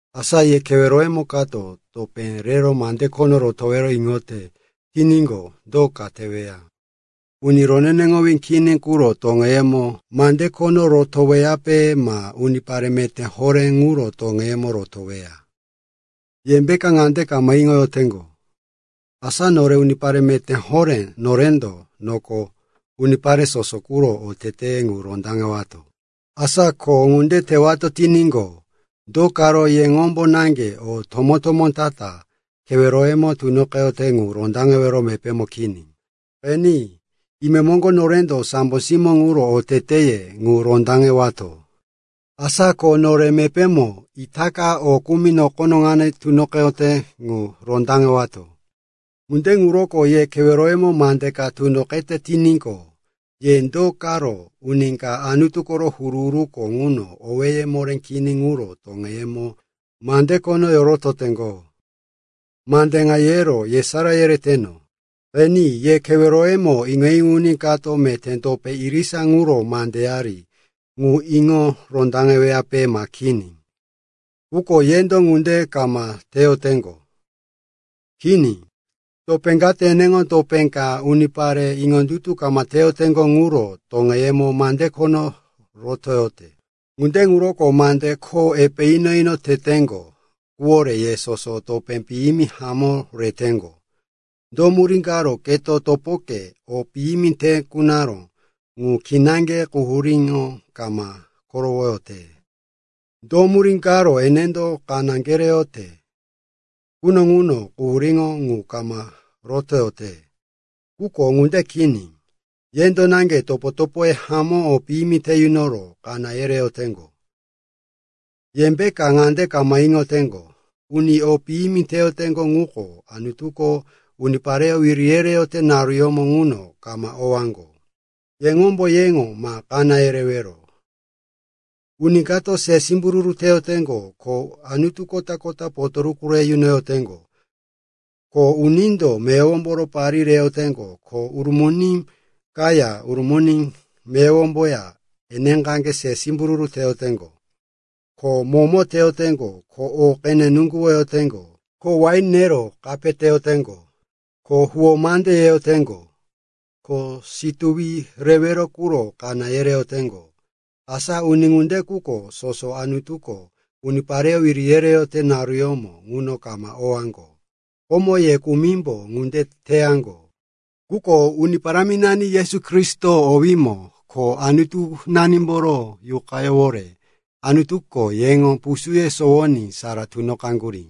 Asa ye keweroyemo kato topé rero mande khono rotowero iŋote tiníqo, do ka teweya? Uni roneneŋowí kini quro toŋeyemo mande khono rotoweyape ma unipare meté horé ŋuro toŋeyemo rotoweya? Yembeka ŋande kama iŋoyoteŋgo, asa nore unipare meté horé, norendo noko unipare soso quro oteteye ŋu rondaŋewato? Asa ko ŋunde tewato tiníqo, do karo yeŋombo naŋge o tomó-tomó ta-ta keweroyemo tunoqeyote ŋu rondaŋewero mepémo kini? Qeni, imemoŋgo norendo sambo simó ŋuro oteteye ŋu rondaŋewato. Asa ko nore mepémo itaka o kumi nokono ŋano tunoqeyote ŋu rondaŋewato. Ŋunde ŋuroko ye keweroyemo mande ka tunoqete tiníqo, ye do karo uni ka Anutu koro huru-huruko ŋuno owéye moré kini ŋuro toŋeyemo mande khono yorototeŋgo? Mande ŋa yero yesará yereteno. Qeni, ye keweroyemo iŋo-iŋo uni kato meté topo irisa ŋuro mandeyari ŋu iŋo rondaŋeyoweyape ma kini? Quko yendo ŋunde kama teyoteŋgo. Kini, topé kato eneŋo topé ka unipare iŋondutu kama teyoteŋgo ŋuro toŋeyemo mande khono rotoyote. Ŋunde ŋuroko mande kho epe ino-ino teteŋgo quwore ye soso topé piyimi hamó reteŋgo. Do murí karo keto topokepo o piyimi te kunaró ŋu kinaŋge quhuríŋo kama korowoyote? Do murí karo enendo kaná kereyote quno ŋuno quhuríŋo ŋu kama rotoyote? Quko ŋunde kini. Yendo naŋge topo-topoye hamó o piyimi te yunoro kaná yereyoteŋgo. Yembeka ŋande kama iŋoteŋgo, uni o piyimi teyoteŋgo ŋuko Anutuko unipareyó wiri yereyote naruyómo ŋuno kama owaŋgo? Yeŋombo yeŋo ma kaná yerewero. Uni kato se simbururu teyoteŋgo, ko anutu kota-kota potoruku re yunoyoteŋgo, ko unindo meyowomboro parí reyoteŋgo, ko urumuni kaya urumuni meyowomboya eneqaŋge se simbururu teyoteŋgo, ko momo teyoteŋgo, ko o qene nuŋguwoyoteŋgo, ko wain nero kape teyoteŋgo, ko huwó mande yeyoteŋgo, ko situwi rewero quro kaná yereyoteŋgo, asa uni ŋunde quko soso Anutuko unipareyó wiri yereyote naruyómo ŋuno kama owaŋgo. Komo ye kumimbo ŋunde teyaŋgo. Quko Uni Paráminani Yesu Kristo owímo ko Anutunanimboro Yuqayówore Anutuko yeŋo pusúye sonowoní sara tunoqaŋgurí,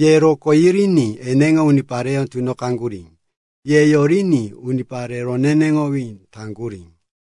ye rokó yiriní eneŋo unipareyó tunoqaŋgurí, ye yoriní unipare roneneŋowí taŋgurí.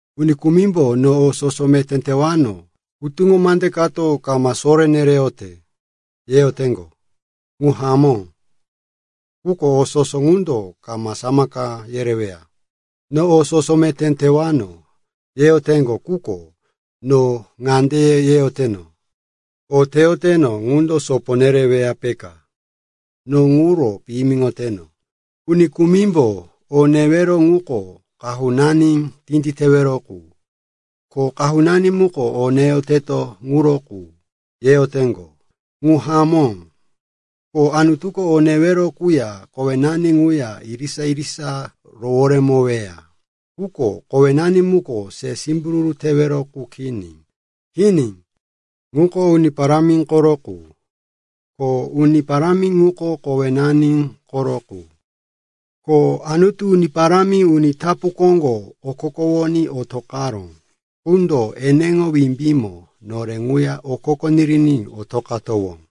Uni kumimbo, “No o soso meté tewano, hutuŋo mande kato kama soré nereyote,” yeyoteŋgo. Ŋu hamó, quko o soso ŋundo kama samaka yereyoweya. “No o soso meté tewano,” yeyoteŋgo, quko no ŋande yeyoteno, “O teyoteno ŋundo sopo nereweya, peka. No ŋuro piyimiŋoteno.” Uni kumimbo, “O newero ŋuko qahunani tinditewero qu, ko qahunani muko o neyoteto ŋuro qu,” yeyoteŋgo. Ŋu hamó, ko Anutuko o newero quya kowenani ŋuya irisa-irisa roworemoweya. Quko kowenani muko se simbururu tewero qu kini. Kini, ŋuko Uni Parámi koro qu, ko Uni Parámi ŋuko kowenani koro qu. Ko Anutu Uni Parámi uni tapu koŋgo okokowoní otoqaró qundo eneŋo wimbímo nore ŋuya okoko niriní otoqowato.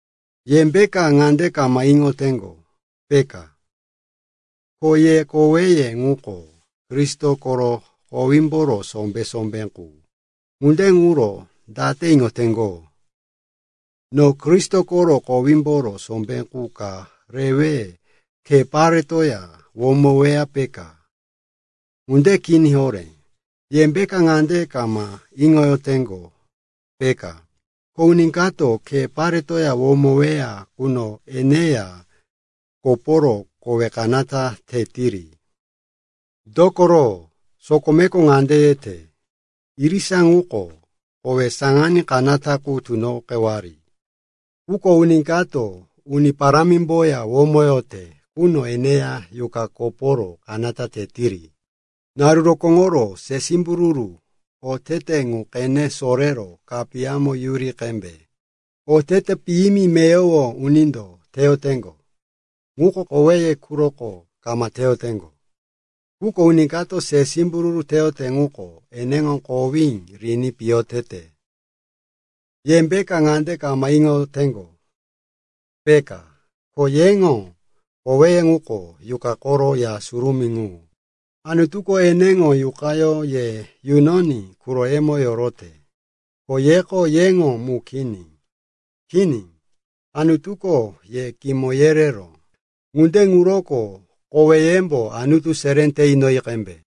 Yembeka ŋande kama iŋoyoteŋgo, peka, ko ye koweye ŋuko Kristo koro kowímboro sombé-sombé qu? Ŋunde ŋuro date iŋoteŋgo, no Kristo koro kowímboro sombé qu ka rewe khe paretoya womoweya, peka? Ŋunde kini horé. Yembeka ŋande kama iŋoyoteŋgo, peka, ko uni kato khe paretoya womoweya quno eneya koporo kowe kanata tetiri? Dokoro sokomeko ŋande yete, “Irisa ŋuko kowe saŋaní kanata qu tunoqewari.” Quko uni kato Uni Parámimboya womoyote quno eneya yuqa koporo kanata tetiri. Naru rokóŋoro se simbururu otete ŋu qene sorero kapiyamo yuri qembe. Otete piyimi meyowo unindo teyoteŋgo ŋuko koweye quroko kama teyoteŋgo. Quko uni kato se simbururu teyote ŋuko eneŋo kowí riní piyo tete. Yembeka ŋande kama iŋoyoteŋgo, peka, ko yeŋo koweye ŋuko Yuqa koro ya surumí mu. Anutuko eneŋo Yuqayó ye yunoní quroyemo yorote, ko yeko yeŋo mu kini. Kini, Anutuko ye kimo yereró. Ŋunde ŋuroko koweyembo Anutu seré te inoyi qembe.